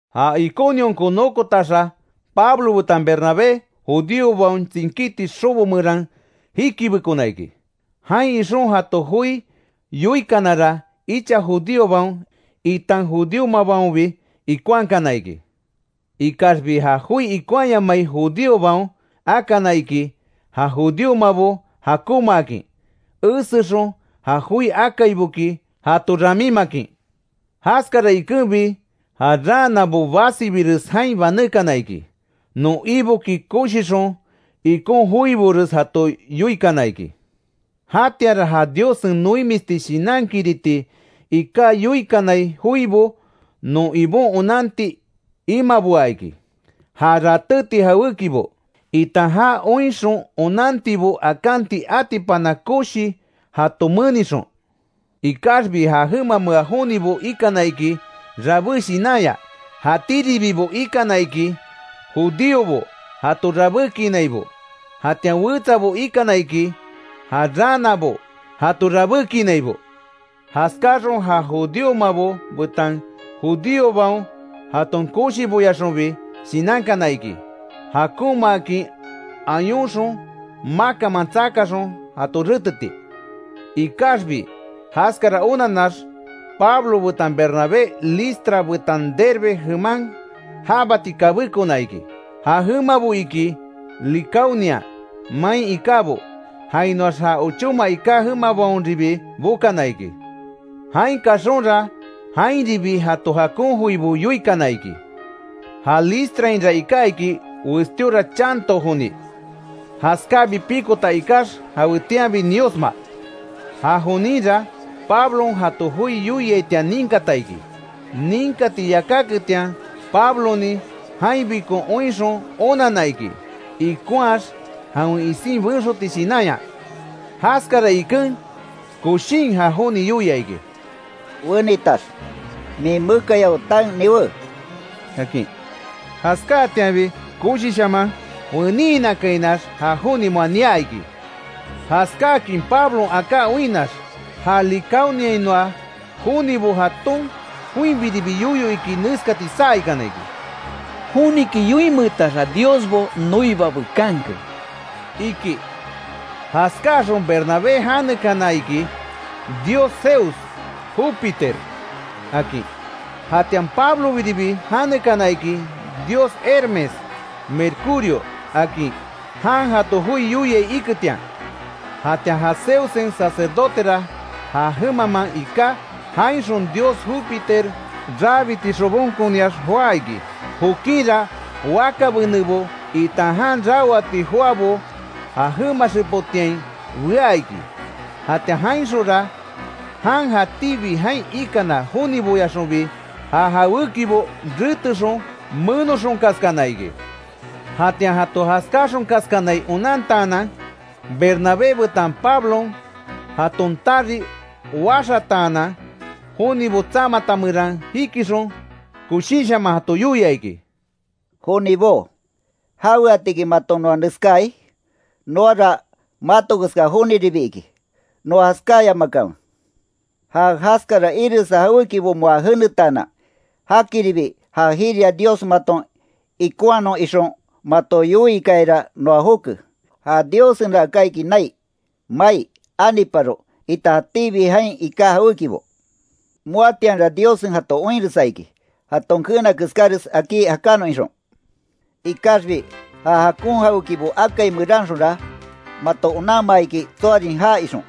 Ja Iconionko nokotaxa, Pablo betan Bernabé judíobaon tsinkíti xobo meran jikibekona iki. Jain ixon jato joi yoikanara, icha judíobaon itan judíomabaonbi ikonhakana iki. Ikaxbi ja joi ikonhayamai judíobaon akana iki, ja judíomabo jakonmaakin esexon, ja joi akaiboki jato ramímakin. Jaskara ikenbi, ja raanabo basibires jain banékana iki. Non Iboki koshixon ikon joibores jato yoikana iki. Jatianra ja Diossen noimisti shinankiriti iká yoikanai joibo, non Ibon onanti imaboa iki, ja ratéti jawékibo, itan ja oinxon onantibo akanti atipana koshi jato menixon. Ikaxbi ja jemamea jonibo ikana iki, rabé shinanya, jatíribibo ikana iki, judíobo jato rabékinaibo, jatian wetsabo ikana iki ja raanabo jato rabékinaibo. Jaskáxon ja judíomabo betan judíobaon jaton koshiboyaxonbi shinankana iki, jakonmaakin ayonxon makanman tsakaxon jato reteti. Ikaxbi jaskara onanax, Pablo betan Bernabé Listra betan Derbe jeman jábati kabékona iki, ja jemabo iki Licaonia main ikábo; jainoax ja ochóma iká jemabaonribi bokana iki. Jain kaxonra, jainribi jato jakon joibo yoikana iki. Ja Listrainra iká iki, westíora chanto joni, jaskábi pikota ikax, jawetianbi niosma. Ja joninra, Pablon jato joi yoiaitian ninkata iki. Ninkati yakáketian Pablonin jainbikon oinxon onanna iki, ikonhaax jawen isin benxoti shinanya. Jaskara iken, koshin ja joni yoia iki: —¡Wenitax, min mekayao taen niwé! —akin. Jaskáatianbi koshishaman weniinakainax, ja joni moa nia iki. Jaskáakin Pablon aká oinnax, ja Licaoniainoa jonibo jaton joinbiribi yoyo iki neskati saa ikana iki: —¡Joniki yoinmeetaxa diosbo noiba bekanke! —iki. Jaskáxon Bernabé janekana iki, dios Zeus (Jupiter) akin. Jatian Pablobiribi janekana iki dios Hermes (Mercurio) akin, jan jato joi yoiai iketian. Jatian ja Zeussen sacerdotera ja jemamaan iká, jainxon dios jupiter rabiti xobonkoniax joá iki. Jokinra wakabenebo, itan jan raoati joabo ja jema xepotiain bea iki; jatian jainxonra jan, jatíbi jain ikana joniboyaxonbi, ja jawékibo retexon, menoxonkaskana iki. Jatian jato jaskáxonkaskanai onantaanan, Bernabé betan Pablon jaton tari waxataanan, jonibo tsamata meran jikixon, koshinshaman jato yoia iki: —Jonibó ¿Jaweatiki maton noa neskaai? Noara mato keska joniribi iki, noa jaskáyamakanwe. Ja jaskara iresa jawékibo moa jenetaanan, jakiribi ja jiria Dios maton ikonhanon ixon mato yoiikayara noa joke. Ja Diossenra aká iki nai, mai, aniparo, itan jatíbi jain iká jawékibo. Moatianra Diossen jato oinresa iki jaton keena keskáres akí jakanon ixon. Ikaxbi ja jakon jawékibo akai meranxonra, mato onanmaa iki tsoarin já ixon,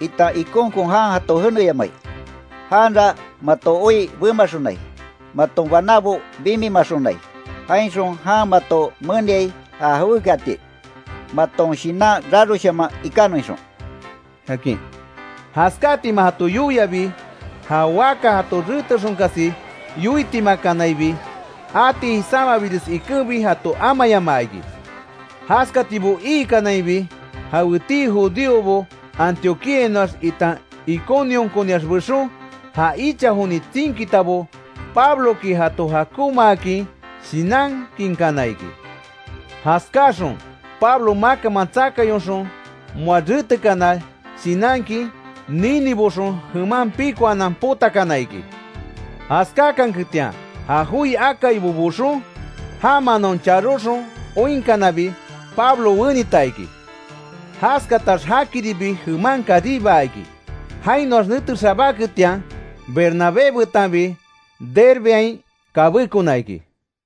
itan ikonkon jan jato jeneyamai. Janra mato oi bemaxonai, maton banábo bimimaxonai, jainxon jan mato meniai ja jawékiati, maton shinan raroshaman ikanon ixon —akin. Jaskáatima jato yoiabi, ja waka jato retexonkasi yoitimakanaibi, ati jisámabires ikenbi jato amayamaa iki. Jaskatibo iikanainbi, jawetii judíobo Antioquíainoax itan Iconionkoniax bexon, ja icha joni tsinkitabo Pabloki jato jakonmaakin shinankinkana iki; jaskáxon Pablo makanman tsakayonxon moa retekana shinankin, niniboxon jeman pikoanan potakana iki. Jaskákanketian ja joi akaibo boxon, já manáon charoxon oinkanabi, Pablo wenita iki. Jaskatax jakiribi jeman karibaa iki, jainoax nete xabáketian Bernabé betanbi Derbeain kabékona iki.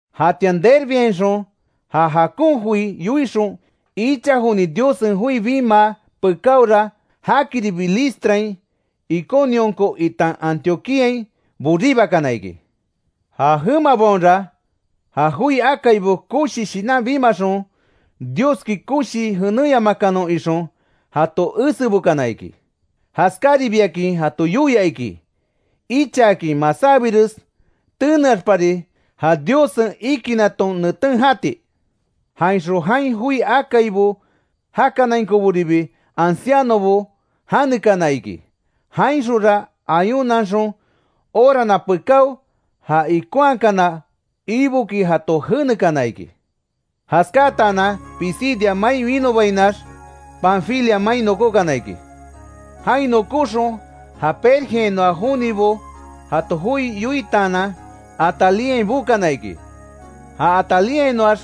Jatian Derbeainxon ja jakon joi yoixon, icha joni Diossen joi bimaa pekáora, jakiribi Listrain, Iconionko itan Antioquíain boribakana iki. Ja jemabaonra, ja joi akaibo koshi shinan bimaxon, Dioski koshii jenéyamakanon ixon, jato esebokana iki. Jaskáribiakin jato yoia iki, ichaakin masábires teneaxpari ja Diossen ikinaton neten jati. Jainxon jain joi akaibo jakanainkoboribi, ancianobo janekana iki. Jainxonra ayunanxon orana pekáo, ja ikonhakana Iboki jato jenekana iki. Jaskátanan Pisidia mai winobainax, Panfilia main nokókana iki. Jain nokóxon, ja Pergeainoa jonibo jato joi yoitaanan, Atalíain bokana iki. Ja Atalíainoax,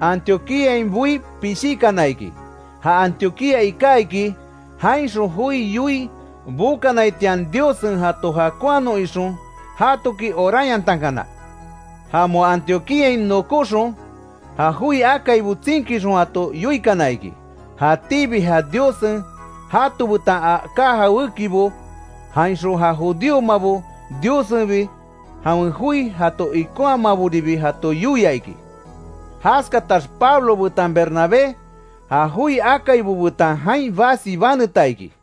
Antioquíain boí pishíkana iki. Ja Antioquía iká iki, jainxon joi yoii bokanaitian, Diossen jato jakonhanon ixon, jatoki oranyantankana. Ja moa Antioquíain nokóxon, ja joi akaibo tsinkixon jato yoikana iki, jatíbi ja Diossen jato betan aká jawékibo. Jainxon ja judíomabo Diossenbi jawen joi jato ikonhamaboribi jato yoia iki. Jaskatax Pablo betan Bernabé, ja joi akaibo betan jain basi baneta iki.